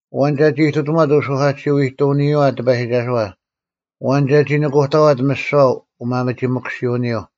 ᐊᐛᓐ ᒐᒋ ᐎᑕᒺᑦ ᐅᓱᐧᑲᑎᓯᐅ-ᐃᑐᐅᓂᔪᐛ ᑎᐸᔨᒋᒐᓱᐛ? ᐊᐛᓐ ᒐᒋ ᓄᑯᑕᐛᑦ ᒥᓯᐛ ᐅᒪᒥᒋᒥᑯᓯᐅᓂᔪᐤ?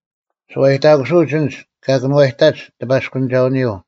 ᓱᐛᔨᑕᑯᓱᐅᒡ ᐊᓐᒡ ᑲ ᑭᓄᐛᔨᑕᒡ ᑎᐸᔅᑯᓂᒐᐅᓂᔪᐤ,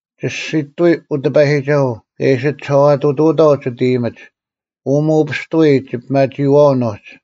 ᒋᔅᒋᑐᐎ, ᐅ ᑎᐸᔨᒋᒐᓱᐤ, ᑲ ᐃᓯ ᒋᓴᐛᑐᑐᐅᑥᐤ ᒋᑦ ᐃᔨᒥᒡ: ᐅ ᒧᐅᐱᔅᑐᐎ ᒋᐱᒪᒋᐃᐛᐅᓐ ᐅᒡ;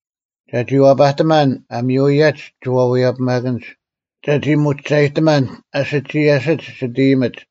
ᒐᒋ ᐛᐸᑎᒪᓐ ᐊ ᒥᔪᐊᔭᒡ ᒋᐅᐛᔭᐱᒪᑭᓐᒡ, ᒐᒋ ᒧᒋᒐᔨᑎᒪᓐ ᐊ ᓯᒋᔭᓯᒡ ᒋᑦ ᐃᔨᒥᒡ,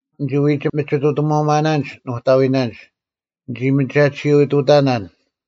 ᓂᒋ ᐎᒋ ᒥᒋᑐᑎᒧᒪᓇᓐᒡ ᓄᑕᐎᓇᓐᒡ, ᓂᒋ ᒥᒐᑎᓱᐅ-ᑐᑕᓇᓐ,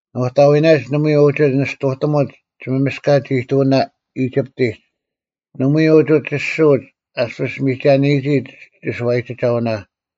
ᓄᑕᐎᓇᓐᒡ ᓇᒪᐎᔾ ᐅᒋ ᓂᔅᑐᑎᒧᒡ ᒋᒪᒥᔅᑲᒡ-ᐃᑐᐅᓇ ᐃᒋᑉᑎᒡ; ᓇᒪᐎᔾ ᐅᒋ ᒋᔅᒋᐅᒡ ᐊᔅᐱᔅ ᒥᒐᓂᔨᒋ ᒋᓱᐛᔨᒋᒐᐅᓇ;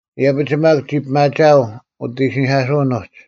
ᐃᔭᐱᒡ ᒪᒃ ᒋ ᐱᒪᒋᐊᐤ ᐅᑦ ᐃᓯᓂᐧᑲᓱᐅᓐ ᐅᒡ,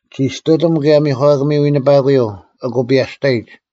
ᒋ ᔅᑐᑎᒻ ᑭᔭ ᒥᒂᑭᒥ ᐎᓂᐸᑯᔪᐤ, ᐊᑯ ᐱᐊᔅᑕᔨᒡ: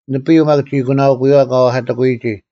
ᓂᐱᔪᐤ ᒪᒃ ᒋ ᐊᒂᓇᐅᑯᔪᐛ ᑲ ᐛᐧᑲᑎᑯᔨᒋ;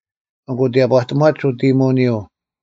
ᐊᑯ ᑎᔭᑈᑎᒺᒡ ᐅᑦ ᐃᔨᒧᐅᓂᔪᐤ;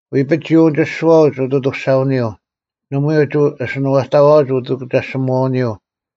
ᐎᐱᒡ ᒋ ᐅᓂᒋᔅᒋᐛᐅᒡ ᐅᑦ ᐊᑐᔅᒐᐅᓂᔪᐤ; ᓇᒪᐎᔾ ᐅᒋ ᐊᓯᓂᐛᑕᐛᐅᒡ ᐅᑭᒐᔅᒋᒧᐛᐅᓂᔪᐤ: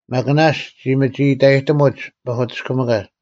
ᒪᒃ ᓇᔅᒡ ᒋ ᒥᒋᐃᑕᔨᑎᒧᒡ ᐸᐧᑯᑎᔅᑭᒥᑲᒡ;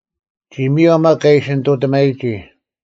ᒋ ᒥᔭᐤ ᒪᒃ ᑲ ᐃᓯ ᓂᑐᑎᒪᔨᒋ;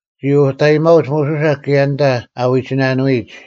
ᒋ ᐅᑕᔨᒪᐅᒡ ᒧᓱᓴ ᑭᔭ ᐊᓐᑕ ᐊ ᐎᒋᓇᓄᐎᒡ,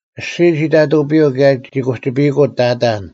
ᐊᔅᒋᔾ ᒋ ᑕᑐᐱᔪᐤ ᑭᔭ ᒋ ᑯᒋᐸᔨᐃᑯᐤ ᑕᑕᓐ,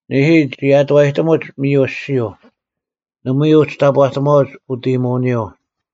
ᓂᐦᐃ, ᒋ ᐊᑐᐛᔨᑎᒧᒡ ᒥᔪ ᐊᔅᒋᔪᐤ; ᓇᒪᐎᔾ ᐅᒋ ᑕᑈᑎᒺᐅᒡ ᐅᑦ ᐃᔨᒧᐅᓂᔪᐤ;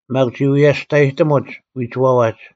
ᒪᒃ ᒋ ᐎᔭᔅᑕᔨᑎᒧᒡ ᐎᒋᐛᐛᒡ;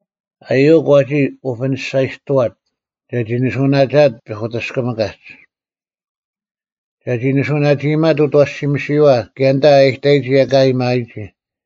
ᐊᔪᐅᒄ ᐛᒋ ᐅᐱᓂᔅᒐᔨᔅᑐᐛᑦ, ᒐᒋ ᓂᓱᐅᓇᒋᐊᑦ ᐸᐧᑯᑎᔅᑭᒥᑲᒡ: ᒐᒋ ᓂᓱᐅᓇᒋᐃᒪᑦ ᐅᑦ ᐊᐛᓯᒥᓯᔨᐛ ᑭᔭ ᐊᓐᑕ ᐊ ᐃᑕᔨᒋ ᐊᑲ ᐊᔭᒥᐊᔨᒋ,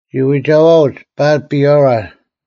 ᒋ ᐎᒐᐛᐅᒡ ᐸᓪ-ᐱᐊᕋ,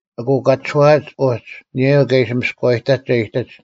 ᐊᑯ ᑲ ᒋᔄᐊᐛᒡ ᐅᒡ ᐊᓂᔭᔪᐤ ᑲ ᐃᓯ ᒥᔅᑯᐛᔭᔨᑕᒡ ᒐ ᐃᔨᑎᒡ: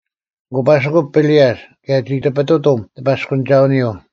ᐊᑯ ᐸᓯᑯᑦ ᐱᓂᔭᔅ, ᑭᔭ ᒋ ᑎᐱᑐᑎᒻ ᑎᐸᔅᑯᓂᒐᐅᓂᔪᐤ: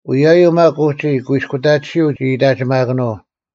ᐅᔭᔪᐤ ᒪᒃ ᐅᒋ ᑯᐃᔅᑯᑕᑎᓯᐤ ᒋ ᐃᑕᒋᒪᑭᓄᐤ,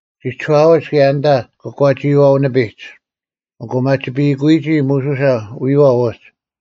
ᒋ ᒋᔄᐊᐅᒡ ᑭᔭ ᐊᓐᑕ ᑯᒂᒋᐃᐛᐤ ᓂᐱᒡ, ᐊᑯ ᒪᒋᐱᐃᑯᔨᒋ ᒧᓱᓴ ᐎᔨᐛᐤ ᐅᒡ;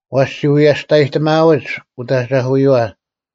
ᐛᔅ ᒋ ᐎᔭᔅᑕᔨᑎᒥᐃᒪᐅᒡ ᐅᑦ ᐊᒐᐧᑯᔨᐛ,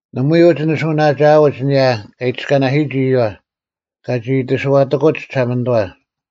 ᓇᒪᐎᔾ ᐅᒋ ᓂᓱᐅᓇᒋᐊᐅᒡ ᐊᓂᔭ ᑲ ᐃᑎᔅᑲᓇᓯᔨᒋ ᐃᔪᐛ, ᑲᒋ ᐃᑎᓱᐛᑎᑯᒡ ᒋᓴᒪᓂᑐᐛ: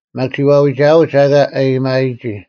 ᒪᒃ ᒋ ᐛᐎᒐᐅᒡ ᐊᑲ ᐊᔭᒥᐊᔨᒋ,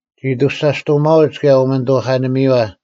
ᒋ ᐊᑐᔅᒐᔅᑐᐅᒪᐅᒡ ᑭᔭ ᐅᒥᓂᑐᐧᑲᓂᒥᔪᐛ;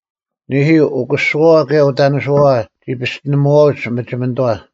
ᓂᐦᐃ, ᐅᑯᓱᐛᐛ ᑭᔭ ᐅᑕᓂᓱᐛᐛ ᒋ ᐱᔅᑎᓂᒧᐛᐅᒡ ᒥᒋᒥᓂᑐᐛ᙮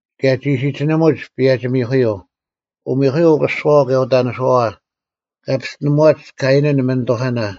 ᑭᔭ ᒋ ᓯᒋᓂᒧᒡ ᐸᔭᒋ-ᒥᐧᑯᔪᐤ, ᐅᒥᐧᑯᒥᔪᐤ ᐅᑯᓱᐛᐛ ᑭᔭ ᐅᑕᓂᓱᐛᐛ, ᑲ ᐱᔅᑎᓂᒧᐛᒡ ᑲᐃᓇᓐ ᒥᓂᑐᐧᑲᓇ: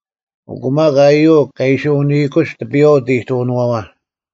ᐊᑯ ᒪᒃ ᐊᔪᐅᒄ ᑲ ᐃᓯ ᐅᓂᐃᑯᒡ ᑎᐱᔨᐛ ᐅᑦ ᐃᑐᐅᓄᐛᐛ,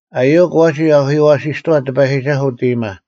ᐊᔪᐅᒄ ᐛᒋ ᐊᐧᑯᔪᐛᓯᔅᑐᐛᑦ ᑎᐸᔨᒋᒐᓱᐤ ᐅᑦ ᐃᔨᒪ,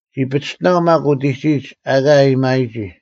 ᒋ ᐸᒋᑎᓇᐤ ᒪᒃ ᐅᑎᒋᔨᒡ ᐊᑲ ᐊᔭᒥᐊᔨᒋ;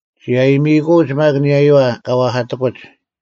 ᒋ ᐊᔨᒥᐃᑯᐅᒡ ᒪᒃ ᐊᓂᔭᔪᐛ ᑲ ᐛᐧᑲᑎᑯᒡ,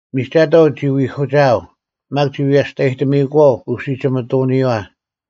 ᒥᒐᑥᐤ ᒋ ᐎᐧᑯᒋᐊᐤ; ᒪᒃ ᒋ ᐎᔭᔅᑕᔨᑎᒥᐃᑯᐛᐤ ᐅᓯᒋᒥᑐᐅᓂᔨᐛ,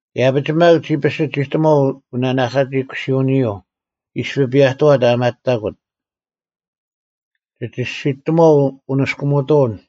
ᐃᔭᐱᒡ ᒪᒃ, ᒋ ᐱᓯᒋᑎᒺᐤ ᐅᓂᓇᐧᑲᒋᐃᑯᓯᐅᓂᔪᐤ, ᐃᔅᐱ ᐱᔭᑐᐛᑦ ᐊ ᒪᑕᑯᑦ; ᒋ ᒋᔅᒋᑎᒺᐤ ᐅᓂᔅᑯᒥᑐᐅᓐ,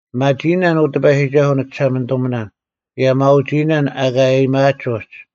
ᐱᒪᒋᐃᓇᓐ, ᐅ ᑎᐸᔨᒋᒐᓱᐤ ᓂᒋᓴᒪᓂᑐᒥᓇᓐ, ᑭᔭ ᒪᐅᒋᐃᓇᓐ ᐊᑲ ᐊᔭᒥᐊᒡ ᐅᒋ,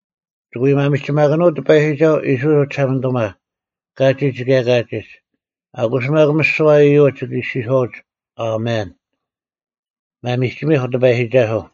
ᒋᑭ ᐎ ᒪᒥᒋᒪᑭᓄᐤ ᑎᐸᔨᒋᒐᓱᐤ ᐃᔅᕋᐃᓪ ᐅᒋᓴᒪᓂᑐᒪ, ᑲᒋᒡ ᑭᔭ ᑲᒋᒡ: ᐊᑯᔅ ᒪᒃ ᒥᓯᐛ ᐃᔪᒡ ᒋᑭ ᐃᔅᒋᔄᐛᒡ, “ᐊᒥᓐ᙮” ᒪᒥᒋᒥᐧᒄ ᑎᐸᔨᒋᒐᓱᐤ!